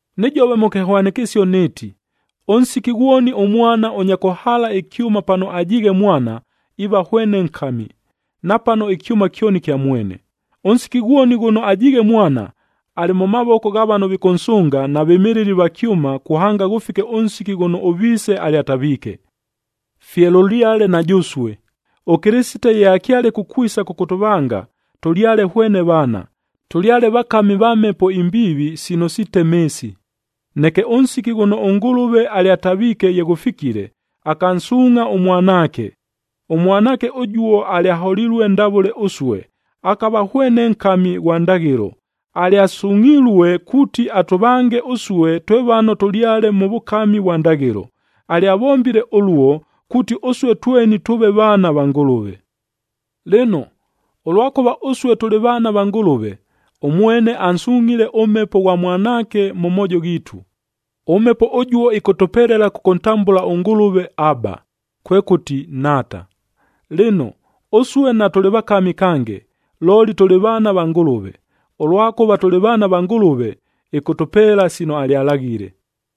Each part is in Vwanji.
Nɨjove mʉ kɨhwanɨkɨsio nɨɨti, ʉnsiki ghwoni ʉmwana ʉnya kʉhaala ɨkyʉma pano ajiighe mwana, iiva hwene nkami, napano ɨkyʉma kyoni kya mwene. Ʉnsiki ghwoni ghʉno ajiighe mwana, alɨ mʉ mavoko gha vano vikʉnsʉnga na vɨmɨlɨli va kyʉma kuhanga ghʉfike ʉnsiki ghʉno ʉviise alyataviike. Fye lʉlyale na jʉsue, ʉKɨlɨsite ye akyale kukwisa kʉkʉtʉvanga, tʉlyale hwene vaana, tʉlyale vakami va mhepo imbiivi sino sitema ɨɨsi. Neke ʉnsiki ghʉno ʉNgʉlʉve alyataviike ye ghʉfikile, akansuungʼha ʉMwanaake. ɄMwanaake ʉjuo alyaholilue ndavʉle ʉsue, akava hwene nkami ghwa ndaghɨlo. Alyasungʼhilue kuuti atʉvange ʉsue twe vano tʉlyale mʉ vʉkami vwa ndaghɨlo. Alyavombile ʉluo, kuuti ʉsue tweni tʉʉve vaana va Ngʉlʉve. Lɨno, ʉlwakʉva ʉsue tʉlɨ vaana va Ngʉlʉve, ʉmwene ansungʼhile ʉMhepo ghwa Mwanaake mʉ moojo ghiitu. ɄMhepo ʉjuo ɨkʉtʉpelela kʉkʉntambʉla ʉNgʉlʉve, “Aba,” kwekʉti, Nhaata. Lɨno, ʉsue natʉlɨ vakami kange, looli tʉlɨ vaana va Ngʉlʉve. Ʉlwakʉva tʉlɨ vaana va Ngʉlʉve, ɨkʉtʉpeela sino alyalaghile.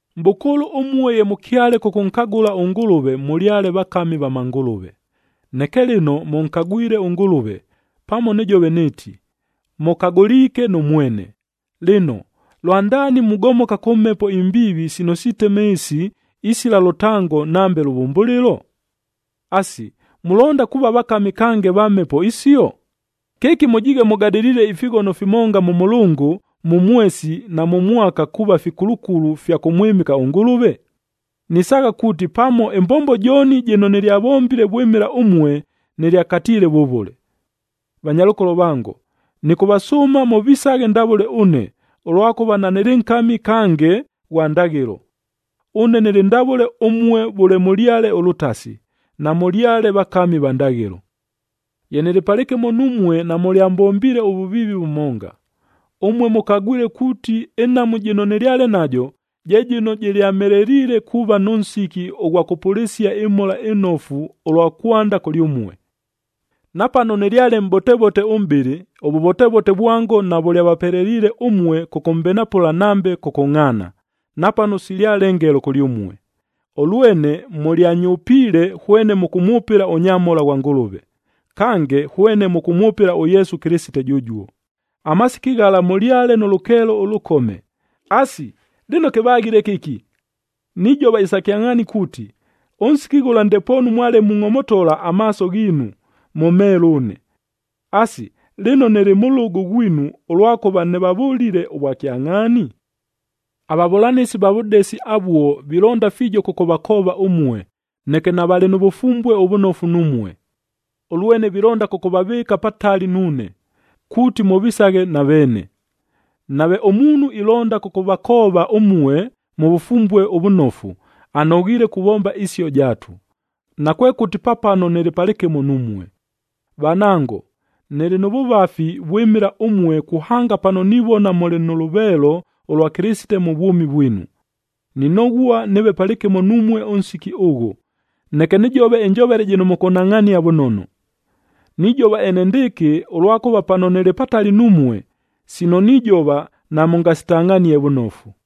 Mʼbʉkʉʉlʉ ʉmue ye mʉkyale kʉkʉnkagʉla ʉNgʉlʉve, mʉlyale vakami va mangʉlʉve. Neke lɨno, mʉnkagwile ʉNgʉlʉve, pamo nɨjove nɨɨti, mʉkagʉliike nʉ mwene. Lɨno, lwandaani mugomoka kʉ mhepo imbiivi sino sitema ɨɨsi isila lʉtango nambe lʉvʉmbʉlɨlo? Asi, mulonda kuuva vakami kange va mhepo isio? Kɨki mʉjiighe mʉgadɨliile ifighono fimonga mʉ mʉlʉngʉ, mʉ mwesi na mʉ mwaka kuuva fikulukulu fya kʉmwɨmɨka ʉNgʉlʉve? Nisaagha kuuti, pamo ɨmbombo jooni jɨno nɨlyavombile vwɨmɨla ʉmue, nɨlyakatiile vʉvʉle! Vanyalʉkolo vango, nɨkʉvasʉʉma mʉvisaghe ndavʉle ʉne, ʉlwakʉva nanɨlɨ nkami kange ghwa ndaghɨlo. Ʉne nɨlɨ ndavʉle ʉmue vʉle mʉlyale ʉlʉtasi, namʉlyale vakami va ndaghɨlo. Ye nɨlɨ palɨkɨmo numue, namʉlyambombiile ʉvʉviivi vʉmonga. Ʉmue mʉkagwile kuuti ɨnhamu jɨno nɨlyale najo, je jɨno jɨlyamheleliile kuuva nʉ nsiki ʉghwa kʉpʉlɨsia ɨMhola ɨNofu ʉlwa kwanda kʉlyʉmue. Napano nɨlyale mʼbotevote ʉmʼbɨlɨ, ʉvʉvotevote vwango navʉlyavapeleliile ʉmue kʉkʉmbenapʉla nambe kʉkʉngʼhaana, napano silyale ngelo kʉlyʉmue. Ʉlwene mʉlyanyʉpiile hwene mʉkʉmwʉpɨla ʉnyamhola ghwa Ngʉlʉve, kange hwene mʉkʉmwʉpɨla ʉYesu Kɨlɨsite jʉjuo. Amasiki ghala mʉlyale nʉ lʉkeelo ʉlʉkome. Asi, lɨno kɨvaghile kɨki? Nijova isa kyangʼhaani kuuti, ʉnsiki ghʉla ndepoonu mwale mungʼomotola amaaso ghiinu, mʉmheele ʉne. Asi, lɨno nɨlɨ mʉlʉgʉ ghwinu ʉlwakʉva nɨvavʉlile ʉvwakyangʼhaani? Avavʉlanɨsi va vʉdesi avuo vilonda fiijo kʉkʉvakoova ʉmue, neke navalɨ nʉ vʉfumbue ʉvʉnofu numue. Ʉlwene vilonda kʉkʉvavɨɨka patali nuune, kuuti mʉvisaghe na veene. Nave ʉmuunhu ilonda kʉkʉvakoova ʉmue mʉ vʉfumbue ʉvʉnofu, anoghiile kuvomba isio jaatu, nakwekʉti pa pano nɨlɨ palɨkɨmo numue. Vanango, nɨlɨ nʉ vʉvafi vwɨmɨla ʉmue kuhanga pano nivona mʉlɨ nʉ lʉveelo ʉlwa Kɨlɨsite mʉ vwʉmi vwinu. Ninoghua nɨɨve palɨkɨmo numue ʉnsiki ʉghʉ, neke nɨjove ɨnjovele jɨno mʉkʉnhangʼhania vʉnono! Nijova enendɨɨkɨ, ʉlwakʉva pano nɨlɨ patali numue, sino nijova namʉngasitangʼhanie vʉnofu!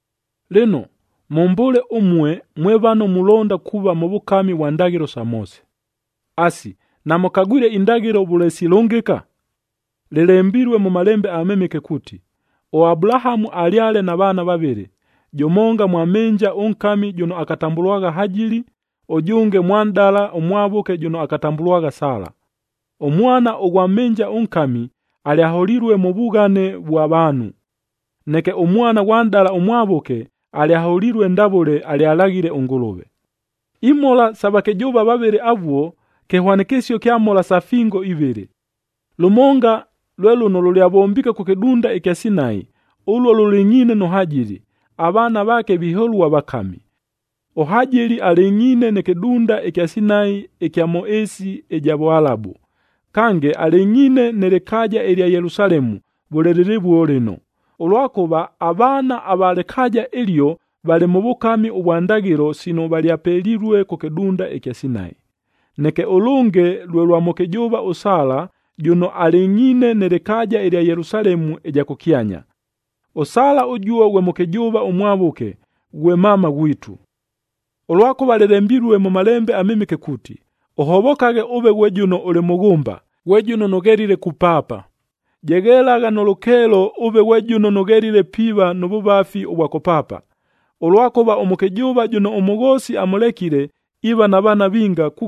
Lɨno, mʉmbʉʉle ʉmue mwe vano mulonda kuuva mʉ vʉkami vwa ndaghɨlo sa Moose! Asi, namʉkagwile indaghɨlo vʉle silʉngɨka? Lɨlembilue mʉ Malembe aMɨmɨke kuuti, ʉAbulahamu alyale na vaana vavɨlɨ, jʉmonga mwa mhɨnja ʉnkami jʉno akatambʉlwagha Hajili, ʉjʉnge mwa nʼdala ʉmwavʉke jʉno akatambʉlwagha Sala. Ʉmwana ʉghwa mhɨnja ʉnkami, alyaholilue mʉ vughane vwa vaanhu. Neke ʉmwana ghwa nʼdala ʉmwavʉke alyaholilue ndavʉle alyalaghile ʉNgʉlʉve. Imhola isa vakɨjʉʉva vavɨlɨ avuo, kɨhwanɨkɨsio kya mhola sa fingoa ivɨlɨ. Lʉmonga lwe lʉno lʉlyavombiike kʉ kɨdunda ɨkya Sinai, ʉluo lʉlɨngʼhiine nʉ Hajili, avaana vaake viholua vakami. ɄHajili alɨngʼhiine nɨ kɨdunda ɨkya Sinai ɨkya mʉ ɨɨsi ɨja Vʉalabu. Kange, alɨngʼhiine nɨ lɨkaaja ɨlya Yelusalemu vʉle lɨlɨvuo lɨno, ʉlwakʉva avaana ava lɨkaaja ɨlio valɨ mʉ vʉkami vwa ndaghɨlo sino valyapelilue kʉ kɨdunda ɨkya Sinai. Neke ʉlʉnge lwe lwa mʉkɨjʉʉva ʉSala, jʉno alɨngʼhiine nɨ lɨkaaja ɨlya Yelusalemu ɨja kʉkyanya. ɄSala ʉjuo ghwe mʉkɨjʉʉva ʉmwavʉke, ghwe mama ghwitu. Ʉlwakʉva lɨlembilue mʉ Malembe aMɨmɨke kuuti, “Ʉhovokaghe, ʉve ghwe jʉno ʉlɨ mʉghʉmba, ghwe jʉno nʉghelile kupaapa. Jeghelagha nʉ lʉkeelo ʉve ghwe jʉno nʉghelile piiva nʉ vʉvafi ʉvwa kʉpaapa, ʉlwakʉva ʉmʉkɨjʉʉva jʉno ʉmʉghoosi amʉlekile, iiva na vaana vinga,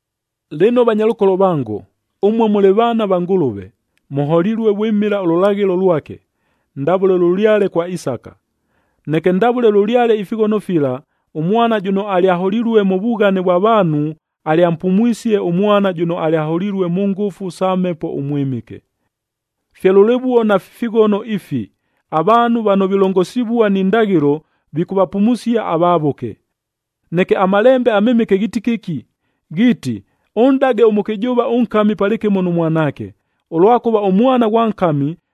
Lɨno, vanyalʉkolo vango, ʉmue mʉlɨ vaana va Ngʉlʉve, mʉholilue vwɨmɨla ʉlʉlaghɨlo lwake, ndavʉle lʉlyale kwa Isaka. Neke ndavʉle lʉlyale ifighono fila, ʉmwana jʉno alyaholilue mʉ vughane vwa vaanhu alyampumwisie ʉmwana jʉno alyaholilue mʉ ngʉfu sa Mhepo ʉMwɨmɨke. Fye lʉlɨvuo nafi fighono ifi, avaanhu vano vilongosivua ni ndaghɨlo vikʉvapumusia avavʉke. Neke aMalembe aMɨmɨke ghiiti kɨki? Ghiiti, “Ʉnʼdage ʉmʉkɨjʉʉva ʉnkami palɨkɨmo nʉ mwanaake, ʉlwakʉva ʉmwana ghwa nkami,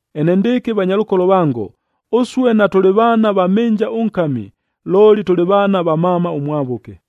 Enendɨɨkɨ vanyalʉkolo vango, ʉsue natʉlɨ vaana va mhɨnja ʉnkami, looli tʉlɨ vaana va mama ʉmwavʉke.